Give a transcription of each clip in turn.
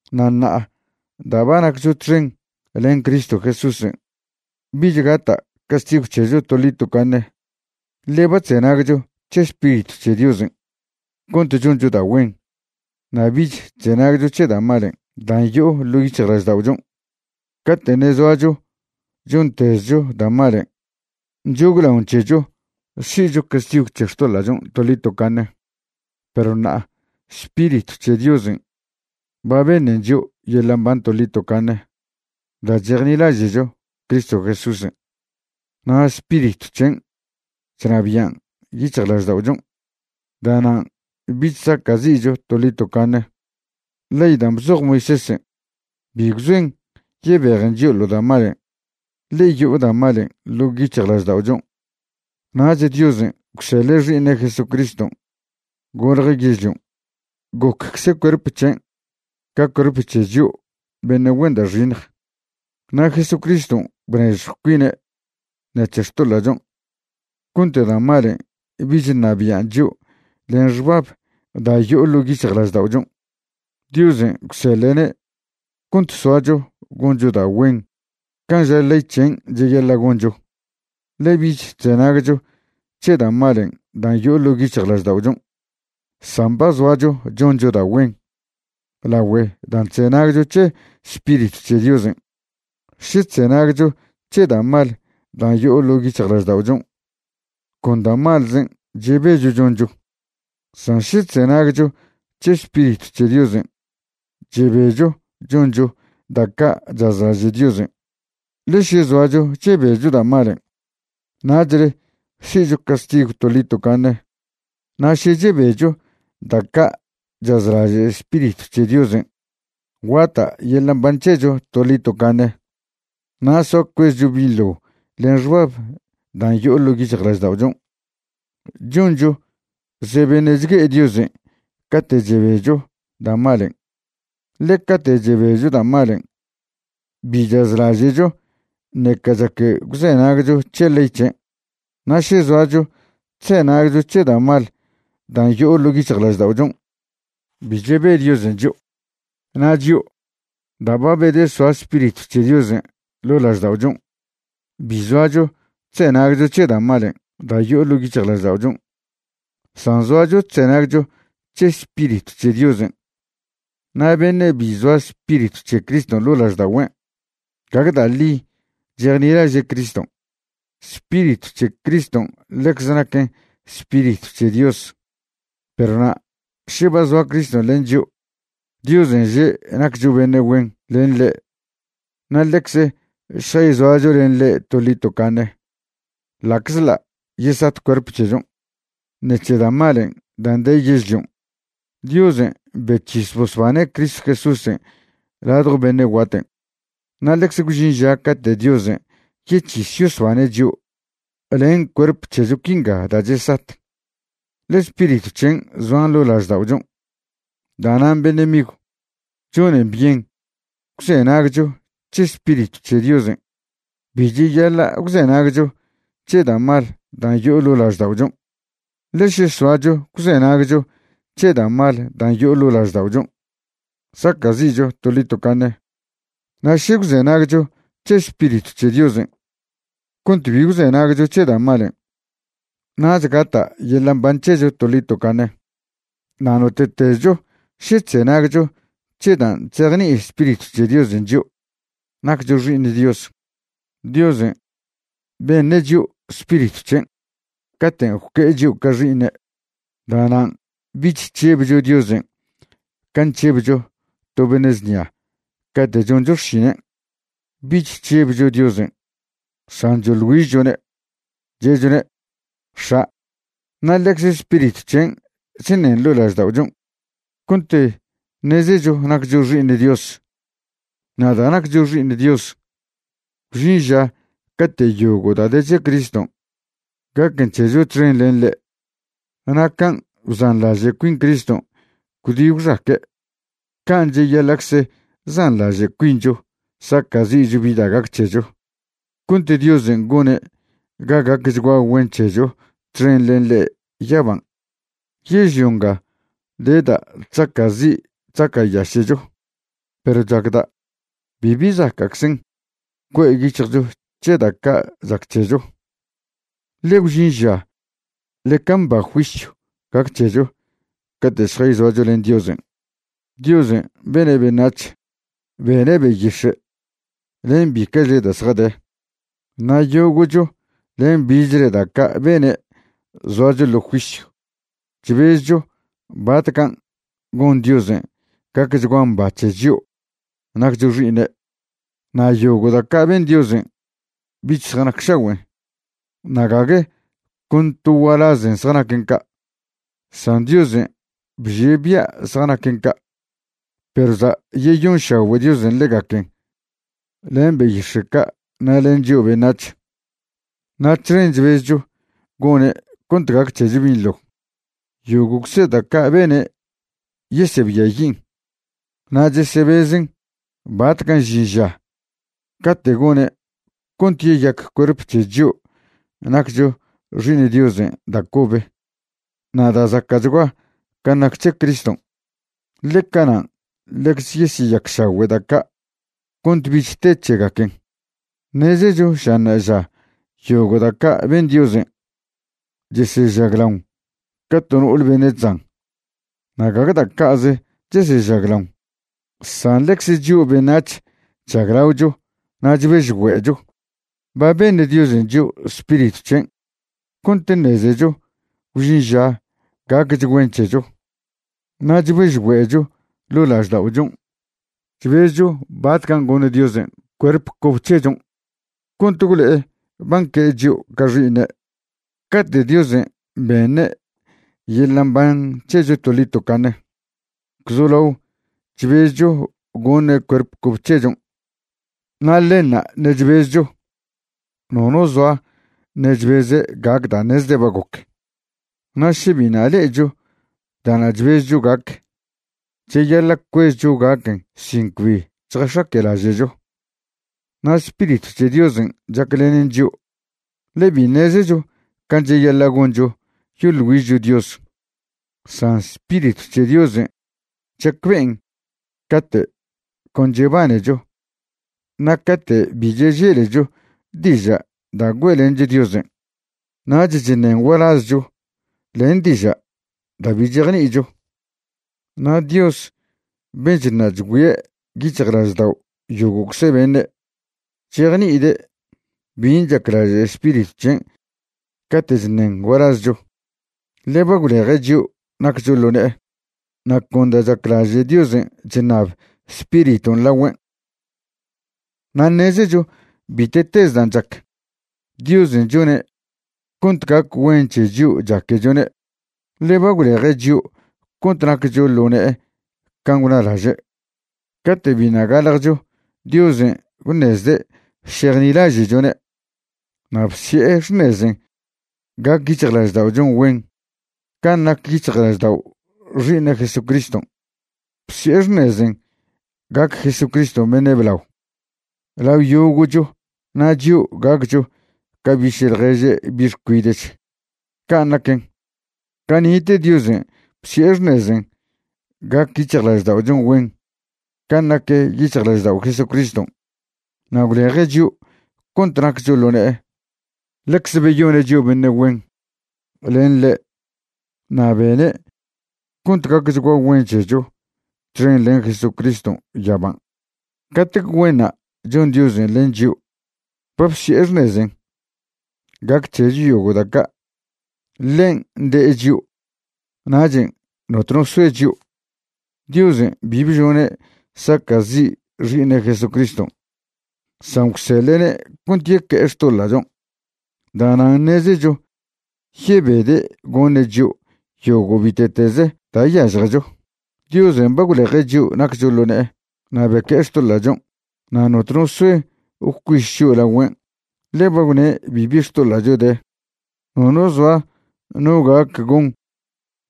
Na' ṉa'a da' ba naccho txen len Cristo Jesúsen', bich gata' castigw c̱hecho toḻi tocaṉe, ḻe ba chzenagcho c̱he Spiritw c̱he Diosen' cont choncho da' güen na' bich chzenagcho c̱he da' malen' dan' yo'o ḻo' yic̱hjlažda'ochon'. Cate' ṉe' zoacho chontezcho da' malen' nchoglaon c̱hecho si'cho castigw c̱he xtoḻa'chon' toḻi tocaṉe, perw ṉa'a Spiritw c̱he Diosen' ba beṉen chio' yeḻa' mban toḻi tocaṉe da' chejnilaže'cho Cristo Jesúsen' na' Spiritw c̱hen' chnabian' yic̱hjlažda'ochon'. Da'nan' bich saca'zi'cho toḻi tocaṉe. Ley da' bzoj Moisésen' bi gwzoen yebejen chio' ḻo' da' malen', ḻe yo'o da' malen' ḻo' yic̱hjlažda'ochon'. Nach Diosen' gwseḻe' Xi'iṉe' Jesucriston' golje' yežlion', goccze cuerp c̱hen' ca cuerp c̱he chio' beṉe' güen da' xiṉj. Na' Jesucriston' bnežjw cuine' ṉec̱he xtoḻa'chon' cont da' malen' bich ṉabian' chio' len xbab da' yo'o ḻo' yic̱hjlažda'ochon'. Diosen' gwseḻe'ne' cont soacho goncho da' güen can' ža ley c̱hen' cheyaḻa' goncho. Ḻe bich chzenagcho c̱he da' malen' dan' yo'o ḻo' yic̱hjlažda'ochon', san ba zoacho choncho da' güen lagüe dan' chzenagcho c̱he Spiritw c̱he Diosen'. Še chzenagcho c̱he da' mal dan' yo'o ḻo' yic̱hjlažda'ochon', con da' malzen' chebecho choncho; san še chzenagcho c̱he Spiritw c̱he Diosen', chebecho choncho da' ca' chazlaže' Diosen'. Ḻe še zoacho chebecho da' malen', nachle si'cho castigw toḻi tocaṉe, na' še chebecho da' ca' chazlaže' Spiritw c̱he Diosen', guata' yeḻa' mban c̱hecho toḻi tocaṉe na' soa cuezcho binḻo len xbab dan' yo'o ḻo' yic̱hjlažda'ochon'. Choncho ze beṉe' chgue'e Diosen' cate' chebecho da' malen', ḻe cate' chebecho da' malen' bi chazlaže'cho ṉeca chac gwzenagcho c̱he ley c̱hen'. Na' še zoacho chzenagcho c̱he da' mal dan' yo'o ḻo' yic̱hjlažda'ochon', bi chebe Diosen' chio'. Na' chio', da' ba bedesoa Spiritw c̱he Diosen' ḻo' lažda'ochon', bi zoacho chzenagcho c̱he da' malen' da' yo'o ḻo' yic̱hjlažda'ochon', san zoacho chzenagcho c̱he Spiritw c̱he Diosen'. Na' beṉe' bi zoa Spiritw c̱he Criston' ḻo' lažda'ogüen', gague da' ḻi chejnilaže' Criston'. (Spiritw c̱he Criston' ḻecze naquen Spiritw c̱he Dios.) Perw na' še ba zoa Criston' len chio', Diosen' že' naccho beṉe' güen len ḻe' na' ḻecze šjayzoacho len ḻe' toḻi tocaṉe ḻa'czḻa' yesat cuerp c̱hechon' ṉec̱he da' malen' dan' de yežlion'. Diosen' bec̱his bosbane' Cristo Jesúsen' ladjo beṉe' guaten', na' ḻecze gwžin ža cate' Diosen' yec̱his yosbane' chio' len cuerp c̱hecho quinga da' chesat, ḻe Spiritw c̱hen' zoan ḻo' lažda'ochon'. Da'nan' beṉe' migw, chonen byen gwzenagcho c̱he Spiritw c̱he Diosen'. Bi cheyaḻa' gwzenagcho c̱he da' mal dan' yo'o ḻo' lažda'ochon'. Ḻe še soacho gwzenagcho c̱he da' mal dan' yo'o ḻo' lažda'ochon', saca'zi'cho toḻi tocaṉe. Na' še gwzenagcho c̱he Spiritw c̱he Diosen' cont bi gwzenagcho c̱he da' malen', nach gata' yeḻa' mban c̱hecho toḻi tocaṉe. Na' note'tezcho še chzenagcho c̱he dan' chzejni'i Spiritw c̱he Diosen' chio', naccho xi'iṉ Dios. Diosen' beṉe' chio' Spiritw c̱hen' caten' gwque'e chio' ca xi'iṉe'. Da'nan' bich chžebcho Diosen' can' chžebcho to beṉe' znia cate' choncho xšinen'. Bich chžebcho Diosen', san choḻ güižchone', che'chone': “X̱a'”. Na' ḻecze Spiritw c̱hen' chṉen ḻo' lažda'ochon' cont ṉezecho naccho xi'iṉ Dios. Na' da' naccho xi'iṉ Dios, gwžin ža cate' yogo' da' de c̱he Criston' gaquen c̱hecho txen len ḻe'. Na' can' bzanḻaže' cuin Criston' gwdi gwxaque', can' cheyaḻa'cze zanḻaže' cuincho saca'zi'cho bi da' gac c̱hecho cont Diosen' gone' ga gacchgua güen c̱hecho txen len ḻe' yaban'. Yežlio nga de da' chzaca'zi' chzaca'yaše'cho. Perw chacda' bibi zaca'czen cue' yic̱hjcho c̱he da' ca' chac c̱hecho, ḻe gwžin ža ḻeca mba juisyw gac c̱hecho cate' šjayzoacho len Diosen'. Diosen' bene' beṉac̱h, bene' beyix̱e', len bica'chle da' zjade. Na' yogo'cho len bichle da' ca' bene' zoacho ḻo juisyw chbezcho batcan' gon Diosen' gacchgua mba c̱he chio' naccho xi'iṉe'. Na' yogo' da' ca' ben Diosen' bich zjanacšagüen'. Na' gague con to gualazen zjanaquen ca', san Diosen' bžie' bia' zjanaquen ca'. Perw za' yeyonšagüe' Diosen' ḻegaquen len beyix̱e' ca' na' len chio' beṉac̱h. Na' txen chbezcho gone' cont gac c̱hecho binḻo. Yogo'cze da' ca' bene' yesebiayin', na' chesebezen batcan' žin ža cate' gone' cont yeyac cuerp c̱he chio' naccho xi'iṉ Diosen' da' cobe na' da' zaca'chgua can' nac c̱he Criston', ḻe canan' ḻecze yesyeyacšagüe' da' ca' cont bich te c̱hegaquen. Ṉezecho ža ṉa'aža yogo' da' ca' ben Diosen' chesežaglaon ca to no'ole beṉe' chzan. Na' gague da' ca'ze chesežaglaon, san lencze chio' beṉac̱h chžaglaocho na' chbežgüe'cho. Ba beṉ Diosen' chio' Spiritw c̱hen' cont ṉezecho gwžin ža gaquech güen c̱hecho. Na' chbežgüe'cho ḻo' lažda'ochon' chbezcho batcan' goṉ Diosen' cuerp cob c̱hechon' cont gwlo'e ba nque'e chio' ca xi'iṉe'. Cate' Diosen' beṉe' yeḻa' mban c̱hecho toḻi tocaṉe gwzolao chbezcho goṉe' cuerp cobe c̱hechon', na' ḻenṉa' ṉe' chbezcho. Nono zoa ṉe' chbeze' gac da' ṉezde' ba goc. Na' še biṉa' le'echo da'na' chbezcho gac, cheyaḻa' cuezcho gaquen sin cbi chjax̱aque'laže'cho. Na' Spiritw c̱he Diosen' chaclenen chio', ḻe bi ṉezecho can' cheyaḻa' goncho yoḻ güižcho Dios, san Spiritw c̱he Diosen' chacbe'en cate' con chebanecho na' cate' bi cheželecho diža' da' güe'lencho Diosen', nach chṉen gualazcho len diža' da' bi chejni'icho. Na' Dios ben' chṉa' chgüie' yic̱hjlaždao' yogo'cze beṉe', chejni'ide' bin' chaclaže' Spiritw c̱hen' cate' chṉen gualazcho, ḻe ba gwleje' chio' naccho ḻo ne'e. Na' con da' chaclaže' Diosen' chṉab Spiriton' lagüen'. Na' ṉezecho bite'tez dan' chac, Diosen' chone' cont gac güen c̱he chio' chaquechone', ḻe ba gwleje' chio' cont naccho ḻo ne'e can' gwnalaže'. Cate' biṉa' galjcho Diosen' gwṉezde' šejnilaže'chone' na' bsi'e xṉezen' gac yic̱hjlažda'ochon' güen can' nac yic̱hjlaždao' Xi'iṉe' Jesucriston'. Bsi'e xṉezen' gac Jesucriston' beṉe' blao lao yogo'cho na' chio' gaccho ca biše' ḻježe' bi' xcuide'ch. Can' naquen, cani'te Diosen' bsi'e xṉezen' gac yic̱hjlažda'ochon' güen can' nac yic̱hjlaždao' Jesucriston' na' gwleje' chio' cont naccho ḻo ne'e. Ḻecze beyone' chio' beṉe' güen len ḻe' na' bene' cont gacchgua güen c̱hecho txen len Jesucriston' yaban'. ¡Catec güenṉa' chon Diosen' len chio' ba bsi'e xṉezen' gac c̱hecho yogo' da' ca'! Ḻen' de'e chio', nachen' notno soe chio'. Diosen' bi bžone' saca'zi' Xi'iṉe' Jesucriston', san gwseḻe'ne' cont yeque'e xtoḻa'chon'. Da'nan' ṉezecho yebede' goṉe' chio' yogo' bite'tez da' yažjecho. Diosen' ba gwleje' chio' naccho ḻo ne'e, na' beque'e xtoḻa'chon'. Na' notno soe gwcuiš chio' lagüen', ḻe ba gwne' bibi xtoḻa'cho de. Nono zoa no gac gon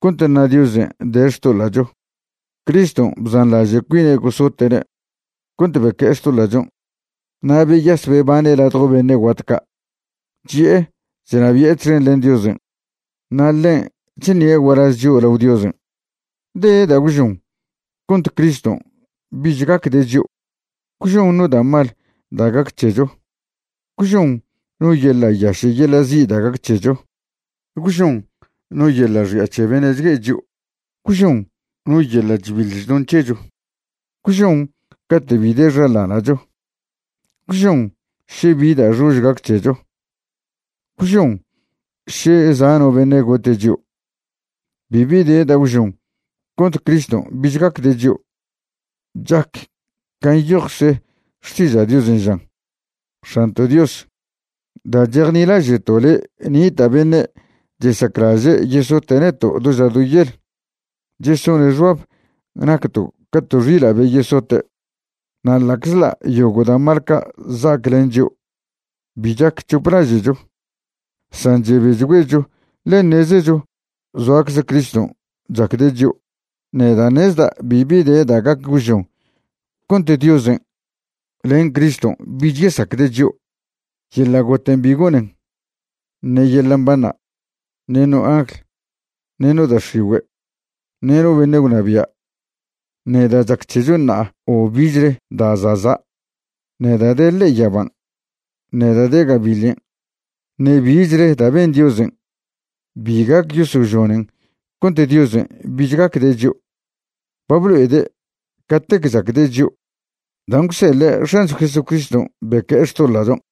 cont ṉa Diosen' de xtoḻa'cho. Criston' bzanḻaže' cuine' gosote'ne' cont beque'e xtoḻa'chon', na' beyas bebane' ladjo beṉe' guat ca', chi'e chnabi'e txen len Diosen'. Na' ḻen' chṉie' gualaz chio' lao Diosen'. ¿De da' gwžon cont Criston' bich gacde' chio'? ¿Gwžon no da' mal da' gac c̱hecho? ¿Gwžon no yeḻa' yaše' yeḻa' zi' da' gac c̱hecho? ¿Gwžon no yeḻa' xi'a c̱he beṉe' chgue'e chio'? ¿Gwžon no yeḻa' chbiḻ chdon c̱hecho? ¿Gwžon cate' bi de xaḻana'cho? ¿Gwžon še bi da' xož gac c̱hecho? ¿Gwžon še za' no beṉe' gote' chio'? Bibi de da' gwžon cont Criston' bich gacde' chio'. Chac can' nyojcze Xtiža' Diosen' žan: X̱anto' Dios, da' chejnilaže'to' le' nita' beṉe' chesaclaže' yesote' neto' do ža do yel. Chesone' xbab nacto' ca to xila' be yesote'. Na' ḻa'czḻa' yogo' da' mal ca' za'ac len chio', bi chac c̱hop laže'cho, san chebechgüecho ḻe ṉezecho zoacze Criston' chacde' chio'. Neda' ṉezda' bibi de da' gac gwžon cont Diosen' len Criston' bich yesacde' chio'. Yeḻa' goten' bi gonen, ṉe yeḻa' mbanṉa', ṉe no angl, ṉe no da' x̱igüe', ṉe no beṉe' gwnabia', ṉe da' chac c̱hecho ṉa'a o bichle da' za'za'. Ṉe da' de ḻe'e yaban', ṉe da' de gabiḻen', ṉe bichle da' ben Diosen' bi gac yosožonen cont Diosen' bich gacde' chio'. Ba blo'ede' catec chacde' chio' dan' gwseḻe' X̱ancho Jesucriston' beque'e xtoḻa'chon'.